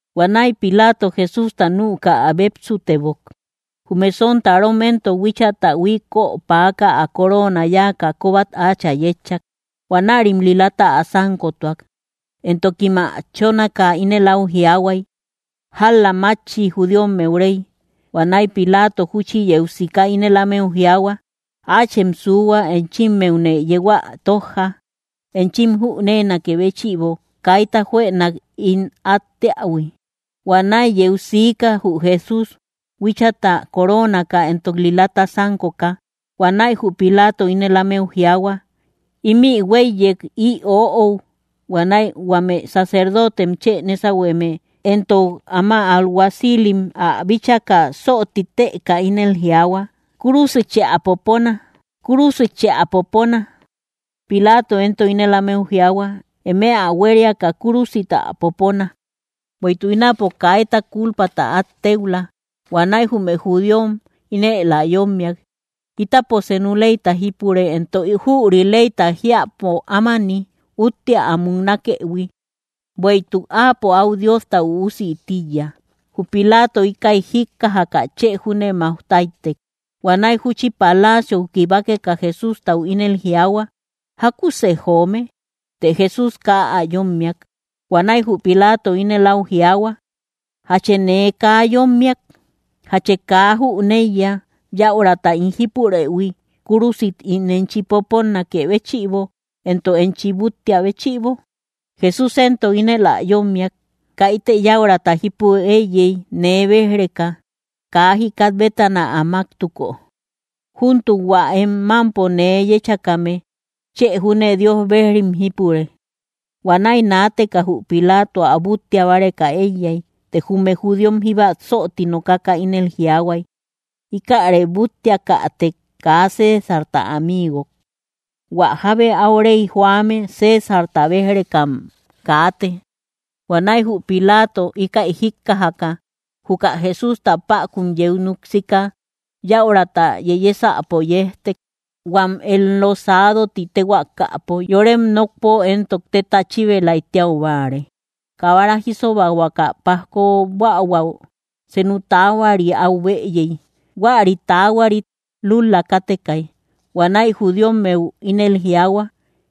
Huanäi Pilaato, Jesústa nüka ä bépsutebok. Jume sontarom éntok huíchata huiköpäaka, ä coroona yáaka, kóbat áachä yétchak. Huanärim lilata ä sánkotuak; éntokim ä chónaka, ínel áu jiaahuay: —¡Jál-la maachi, judíommeu Rey! Huanäi Pilaato júchi yeu sika ínel ámeu jiaahua: —Áachem suuhua, enchimmeune yeu ä tójja, enchim jüneenakë béchïbo kaita juënak ín át teähui. Huanäi yeu siika jü Jesús, huíchata coroonaka éntok lilata sánkoka. Huanäi jü Pilaato ínel ámeu jiaahua: —¡Ímï huéiyek, ï oöou! Huanäi huame Sacerdotem chë nésahueme éntok áma alguacilim ä bíchaka, söti tëka, ínel jiaahua: —¡Kúrusichë ä popona! ¡Kúrusichë ä popona! Pilaato éntok ínel ámeu jiaahua: —Emem ä huériaka kúrusit ä popona, bueïtuk ínapo kaita kúlpata át téuhua. Huanäi jume judíom ínel ä yómmiak: —Ítapo senu leyta jípure, éntok jüri leyta jiäpo ámani, úttea ä muknakëhui, bueïtuk áapo áu Diosta Üusï tíiya. Jü Pilaato íkäi jíkkajaka, chë júne máuj táytek. Huanäi júchi palaciou kibakeka, Jesústau ínel jiaahua: —¿Jákusë joome? Të Jesús kaa ä yómmiak. Huanäi jü Pilaato ínel áu jiaahua: —¿Jachë nee kaa yommiak? ¿Jachë kaa jüneiya yäurata ín jípurëhui, kúrusit ín enchi poponakë béchïbo, éntok enchi búttia béchïbo? Jesús éntok ínel ä yómmiak: —Kaitë yäurata jípu éiyey nee béj‑reka, kaa jikat bétana ä máktuko. Júntuk hua em mámpo nee yéchakame chë júne Dios bejrim jípure. Huanäi naateka jü Pilaato ä búttia báreka éiyay. Të jume judíom jíba söti nokaka, ínel jiaahuay: —Íkäre búttiakätek, ¡kaa Césarta amigok! Huä jábe áu rey joame, Césarta béj‑rekam kaate. Huanäi jü Pilaato íkäi jíkkajaka, juka Jesústa päkun yeu núk sika, yäurata yeyesäpo yejtek, huam Enlosado ti téhuaakapo; yorem nokpo éntok téta chíbelay tíau báare. Kabara jísobahuakä pajko buähuäu, senu taahuari áu bëyey. Huäri taahuarit lúl‑la kátekay. Huanäi judíommeu ínel jiaahua: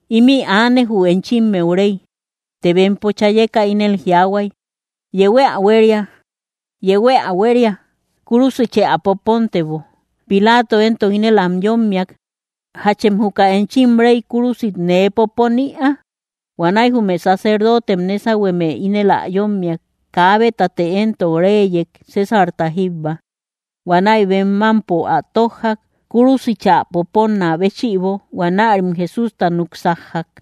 —¡Ímï aane, jü enchimmeu rey! Të bempo chayeka ínel jiaahuay: —¡Yehuë ä huéria! ¡Yehuë ä huéria! ¡Kúrusichë ä popontebo! Pilaato éntok ínel am yómmiak: —¿Jachem juka enchim rey kúrusit nee popon ïaa? Huanäi jume sacerdotem nésahueme ínel ä yómmiak: —Kaabetate éntok reyek, ¡Césarta jíbba! Huanäi bem mámpo ä tójjak, kúrusichä poponnä béchïbo. Huanärim Jesústa núk sájjak.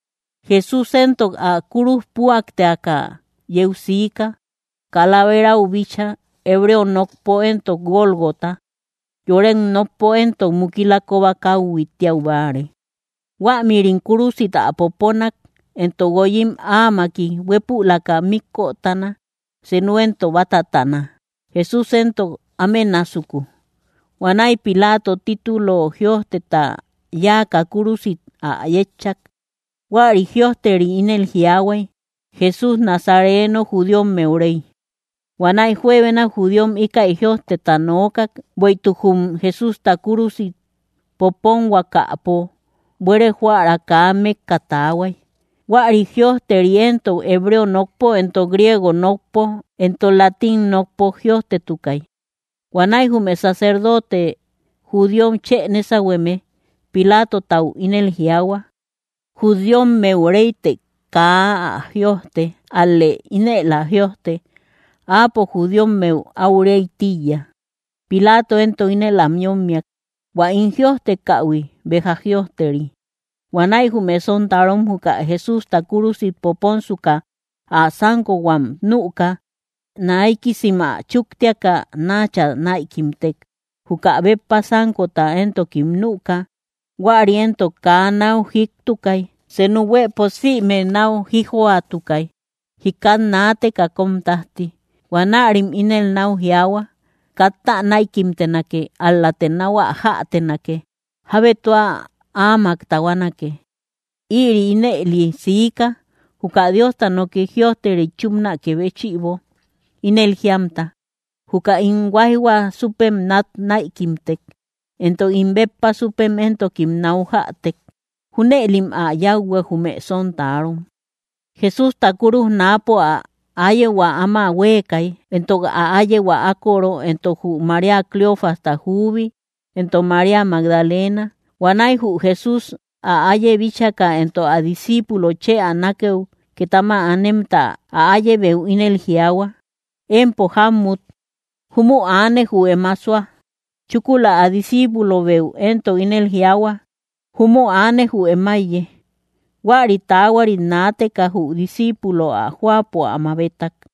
Jesús éntok ä kúruj püakteaka yeu siika, Calaverau bíchaa, hebreo nokpo éntok Gólgota. (Yorem nokpo éntok mukila kóba káuhui tíau báare.) Huämïrim kúrusit ä poponak, éntok guoyim áamaki; huépülaka míkötana, senu éntok bátatana, Jesús éntok áme násuku. Huanäi Pilaato titulo jïojteta yáaka, kúrusit ä yétchak; huäri jïojteri ínel jiaahuay: “Jesús Nazareno, judíommeu Rey.” Huanäi juebena judíom íkäi jïojteta nokak, bueïtuk jum Jesústa kúrusit poponhuakapo buere jóära kaa mékka taahuay. Huäri jïojteri éntok, hebreo nokpo éntok griego nokpo éntok latín nokpo jïojtetukay. Huanäi jume sacerdote judíom chë nésahueme Pilaatotau ínel jiaahua: —Judíommeu Rey të kaa ä jïojte; ál‑lë ínel ä jïojte: “Áapo judíommeu áu Rey tíiya.” Pilaato éntok ínel am yómmiak: —Huä ín jïojtekähui, béja jïojteri. Huanäi jume sontarom juka Jesústa kúrusit poponsuka ä sánkohuam nüka, naikisim ä chúktiaka, náchä näikimtek. Juka béppa sánkota éntokim nüka. Huäri éntok kaa náu jïiktukay; senu huëpo sïme náu jíjjoatukay, jikat naateka kóm tájti. Huanärim ínel náu jiaahua: —Katta näikimtenake, ál‑late náu ä jätenake; jábe tua áamak tahuanake. Ïri ínëli siika, juka Diosta noki jïojteri chúpnakë béchïbo, ínel jíamta: “Juka ín huáijhua súpem nat näikimtek, éntok ín béppa súpem éntokim náu jätek.” Júnëlim ä yáuhuak, jume sontarom. Jesústa kúruj náapo ä áyehua áma huéekay, éntok ä áyehua ákoro, éntok jü María Cleofasta juubi, éntok María Magdalena. Huanäi jü Jesús, ä áiye bíchaka éntok ä disciipulo chë ä nákëu két áma anemta, ä áyebeu ínel jiaahua: —Empo, jámmut, júmü aane jü em ásoa. Chúkula ä disciipulobeu éntok ínel jiaahua: —Júmü aane jü em áiye. Huäri taahuarit naateka jü disciipulo ä jóapo ä mabetak.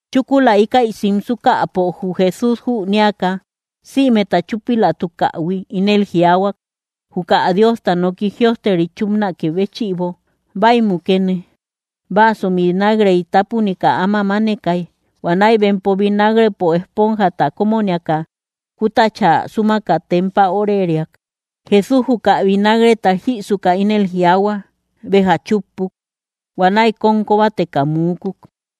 Chúkula íkäi simsukäpo, jü Jesús, jünéaka sïmeta chúpilatukähui, ínel jiaahuak, juka Diosta noki jïojteri chúpnakë béchïbo: —Bäi mukene. Vaaso vinagrey tápunika áma mánekay. Huanäi bempo vinagrepo esponjata kómoniaka, kútachä súmaka tempä óreriak. Jesús, juka vinagreta jïsuka, ínel jiaahua: —Béja chúppuk. Huanäi kóm kóbateka muukuk.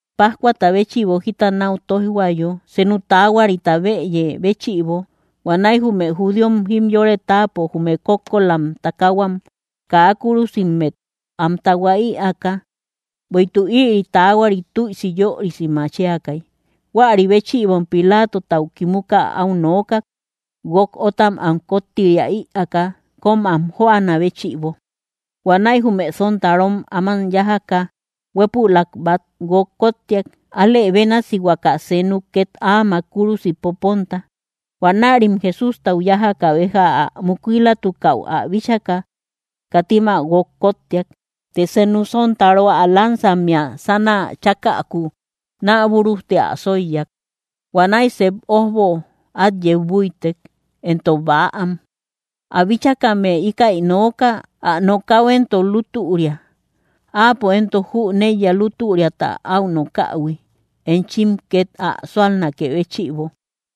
Pájcuata béchïbo jita nau toijhuayo senu taahuarita bëye béchïbo, huanäi jume judíom jimyore táapo jume kókkolam takahuam kaa kúrusimet am tahua ïaaka, bueïtuk ïri taahuari tüisi yörisi machiakay. Huäri béchïbom Pilaatotau kimuka áu nookak, guók óttam am kóttiria ïaaka, kóm am jóanä béchïbo. Huanäi jume sontarom áman yájaka, huépülak bát guók kóttiak, alë bénasi huaka senuk két áamak kúrusit poponta. Huanärim Jesústau yájaka béja ä mukilatukäu ä bíchaka, katim ä guók kóttiak. Të senu sontaro ä lansammea sánä chákäku naa búrujti ä sóiyak. Huanäi sep ójbo át yeu búitek, éntok bäam. Ä bíchakame íkäi nooka; ä nokäu éntok lútüria. Áapo éntok jüneiya lútüriata áu nokähui, enchim két ä súalnakë béchïbo.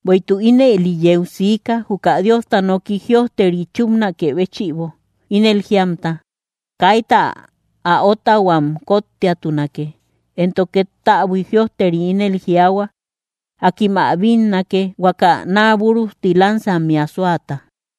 Bueïtuk ínëli yeu siika, juka Diosta noki jïojteri chúpnakë béchïbo, ínel jíamta: “Kaita ä ótahuam kóttiatunake.” Éntok két täbui jïojteri ínel jiaahua: “Akim ä bínnake, huaka naa búrujti lansammea sóata.”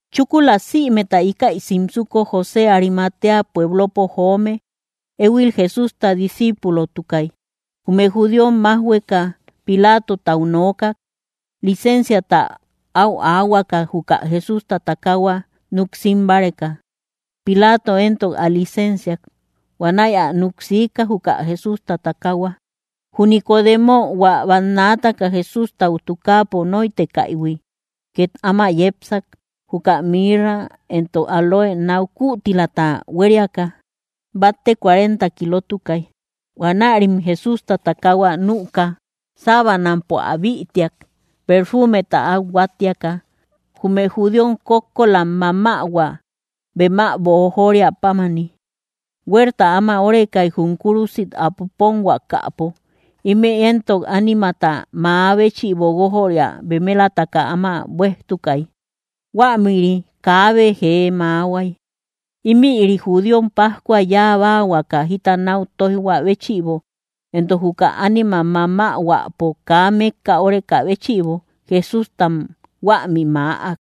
Chúkula sïmeta íkäi simsuko, José Arimatea pueblopo joome, éhuil Jesústa disciipulotukay jume judíom májhueka, Pilaatotau nookak licensiata áu aahuakä, juka Jesústa takaahua núk sim báreka. Pilaato éntok ä licensiak. Huanäi ä núk siika, juka Jesústa takaahua. Jü Nicodemo, hua bannaataka Jesústau tukaapo nóitekaïhui, két áma yepsak, juka mirra éntok áloe náu kütilata huériaka, batte cuarenta kilotukay. Huanärim Jesústa takaahua nüka, sábanampo áa bïtiak perfumeta át huáttiaka, jume judíom kókkolam mamähua, bem ä boojoria pámani. Huerta áma órekay, jum kúrusit ä poponhuakapo. Ímï éntok ánimata mäa béchïbo guójöria bemelataka áma buéijtukay; huämïri kaabe jee mäahuay. Imïri judíom pájcua yabahuakä jita nau toijhua béchïbo, éntok juka ánimam mamähuäpo kaa mékka óreka béchïbo, Jesústam huämi mäak.